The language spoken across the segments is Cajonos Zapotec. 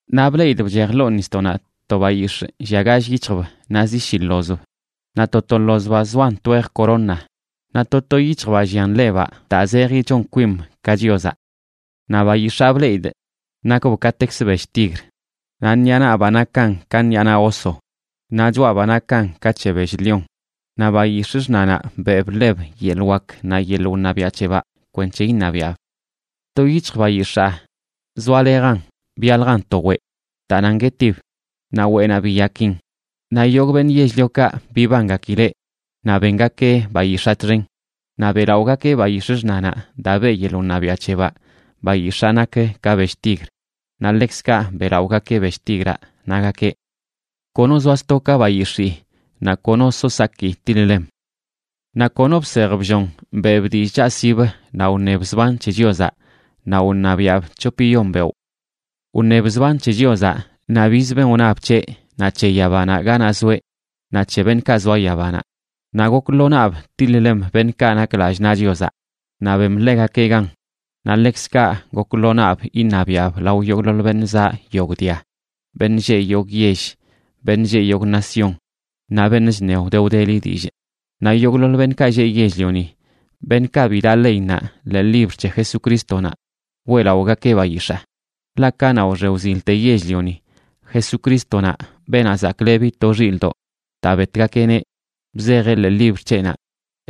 Naꞌ bleꞌidꞌ bchej ḻoo nisdoꞌnaꞌ to bayix̱ꞌ llia gall yic̱hjb naꞌ zi shi ḻozb. Naꞌ to to ḻozbaꞌ zoan twej corona, naꞌ to to yic̱hjbaꞌ llian lebaꞌ daa zeji chon kwim ka Chiozaꞌ. Naꞌ bayix̱aa bleꞌidꞌ, nakb katekzə bell tigra, naꞌ ṉiꞌa nabaꞌ nakan ka ṉiꞌa naꞌ oso, naꞌ choꞌabaꞌ nakan ka c̱he bell lión. Naꞌ bayix̱ꞌ xṉanaꞌ beꞌb ḻeb yeḻꞌ wak naꞌ yeḻꞌ wṉabiaꞌ c̱hebaꞌ kwenc̱he iṉabiaꞌb. To yic̱hj bayix̱aa zoalejan byaljan to weꞌ daa nan guetib, naꞌ weꞌnaꞌ biyakin. Naꞌ yogꞌ beṉꞌ yell-liokaꞌ bibangakileꞌ naꞌ bengakeꞌ bayix̱aa txen. Naꞌ beꞌlaꞌogakeꞌ bayix̱ꞌ xṉanaꞌ, daa beꞌ yeḻꞌ wṉabiaꞌ c̱hebaꞌ bayix̱aa nak ka bell tigr, naꞌ ḻekzkaꞌ beꞌlaꞌogakeꞌ bell tigraꞌ, nagakeꞌ: ―Kono zoa sto ka bayix̱ii, naꞌ kono so saki tiḻ-lem. Naꞌ kono bsej bllon beꞌb dillꞌ chaꞌsibə naꞌ wṉeb zban c̱he Chiozaꞌ, naꞌ wṉabiaꞌb c̱hopiyon beoꞌ. Wṉeb zban c̱he Chiozaꞌ, naꞌ biz ben wnab c̱heꞌ, naꞌ c̱he yabanaꞌ ganaꞌ zoeꞌ, naꞌ c̱he beṉꞌkaꞌ zoa yabanaꞌ. Naꞌ gok lo naꞌb til-ḻem beṉꞌkaꞌ nak lallꞌ naꞌ Chiozaꞌ, naꞌ bem ḻegakeꞌ gan. Naꞌ ḻekzkaꞌ gok lo naꞌb iṉabiaꞌb lao yogꞌḻoḻ beṉꞌ zaꞌ yogꞌ dia, beṉꞌ lleꞌ yogꞌ yell, beṉꞌ lleꞌ yogꞌ nación, naꞌ beṉꞌ chṉe wde wdeli dillꞌ. Naꞌ yogꞌḻoḻ beṉꞌkaꞌ lleꞌ yell-lioni, beṉꞌkaꞌ bi daꞌ leinnaꞌ ḻee libr c̱he Jesucrístonaꞌ, weꞌlaꞌogakeꞌ bayix̱aa. Ḻaꞌ kanaꞌ wxe wzilte yell-lioni, Jesucrístonaꞌ, Beenaꞌ Zaklebi to Xilꞌdoꞌ daa betgakeꞌneꞌ, bzejeꞌ ḻee libr c̱heꞌnaꞌ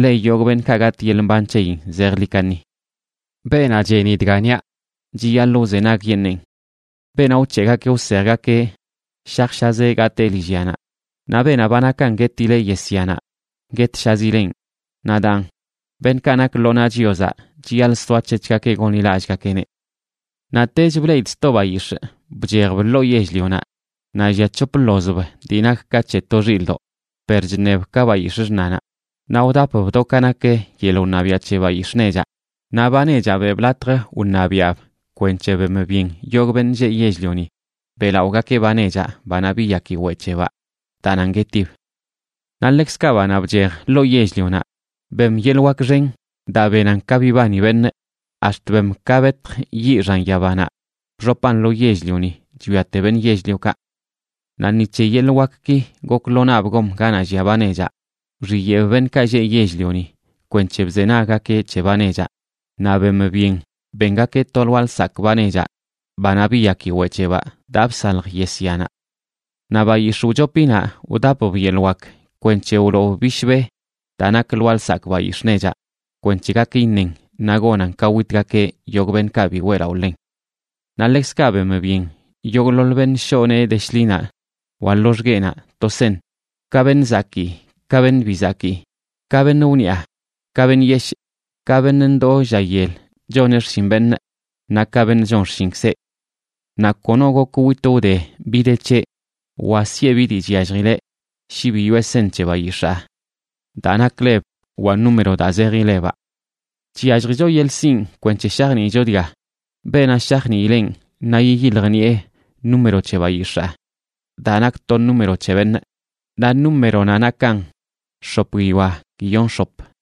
le yogꞌ beṉꞌkaꞌ gatꞌ yeḻꞌ mban c̱heyin zejḻi kaṉi. Beenaꞌ cheni dga niaꞌ, chiyaḻꞌ wzenagyeṉeen. Beenaꞌ wc̱heꞌgakeꞌ wsejgakeꞌ, shajshazeꞌ gatee lillyanaꞌ. Naꞌ beenaꞌ ba nakan guetileꞌ yesyanaꞌ, guetshazileꞌn. Naꞌ daan, beṉꞌkaꞌ nak lo naꞌ Chiozaꞌ chiyaḻꞌ soac̱hec̱hgakeꞌ gonḻilallꞌgakeꞌneꞌ. Naꞌtech bleꞌidꞌ sto bayix̱ꞌ bchejb ḻoo yell-lionaꞌ naꞌ llia c̱hop ḻozb dii nak ka c̱he to xilꞌdoꞌ, per chṉeb ka bayix̱ꞌ xṉanaꞌ. Naꞌ wdapb do ka nak yeḻꞌ wṉabiaꞌ c̱he bayix̱ꞌ nechaꞌ, naꞌ ba nechaꞌ beꞌb latj wṉabiaꞌb kwenc̱he bem byen yogꞌ beṉꞌ lleꞌ yell-lioni beꞌlaꞌogakeꞌ ba nechaꞌ, banaꞌ biyaki weꞌ c̱hebaꞌ daa nan guetib. Naꞌ ḻekzkaꞌ banaꞌ bchej ḻoo yell-lionaꞌ bem yeḻꞌ wak xen daa benan ka bibani beṉꞌ, ax̱t bem ka betj yiꞌ xan yabanaꞌ bxopan lo yell-lioni chwiate beṉꞌ yell-liokaꞌ. Naꞌ ni c̱he yeḻꞌ wakki gok lo naꞌb gom ganaꞌ llia ba nechaꞌ, wxiyeꞌb beṉꞌkaꞌ lleꞌ yell-lioni kwenc̱he bzenaggakeꞌ c̱he ba nechaꞌ, naꞌ bem byen bengakeꞌ to lwaa lsakꞌ ba nechaꞌ banaꞌ biyaki weꞌ c̱hebaꞌ daa bsalj yesyanaꞌ. Naꞌ bayix̱ꞌ wchopinaꞌ wdapb yeḻꞌ wak kwenc̱he wloob bishbe daa nak lwaa lsakꞌ bayix̱ꞌ nechaꞌ, kwenc̱he gak iṉen naꞌ gonan ka witgakeꞌ yogꞌ beṉꞌkaꞌ bi weꞌlaꞌo ḻen. Naꞌ ḻekzkaꞌ bem byen yogꞌḻoḻ beṉꞌ shoꞌ nee de shḻinaꞌ wa loxgueꞌnaꞌ to seṉ, ka beṉꞌ zakii ka beṉꞌ bi zakii, ka beṉꞌ wniꞌa ka beṉꞌ yeshꞌ, ka beṉꞌ ndoo lla yel choneꞌ xshin beṉꞌ naꞌ ka beṉꞌ chon xshinkzeꞌ. Naꞌ kono gok witꞌ wde bi dii de c̱heꞌ wa siꞌe bi dii chyalljileꞌ shi bi yoꞌe seṉ c̱he bayix̱aa daa nak leb wa número daa zeji lebaꞌ. Chyalljicho yeḻꞌ sinꞌ kwenc̱he shajniicho dga. Beenaꞌ shajniileꞌn naꞌ yiyiljniꞌe número c̱he bayix̱aa daa nak to número c̱he beṉꞌ. Naꞌ númeronaꞌ nakan x̱op guiyoa guiyon x̱op.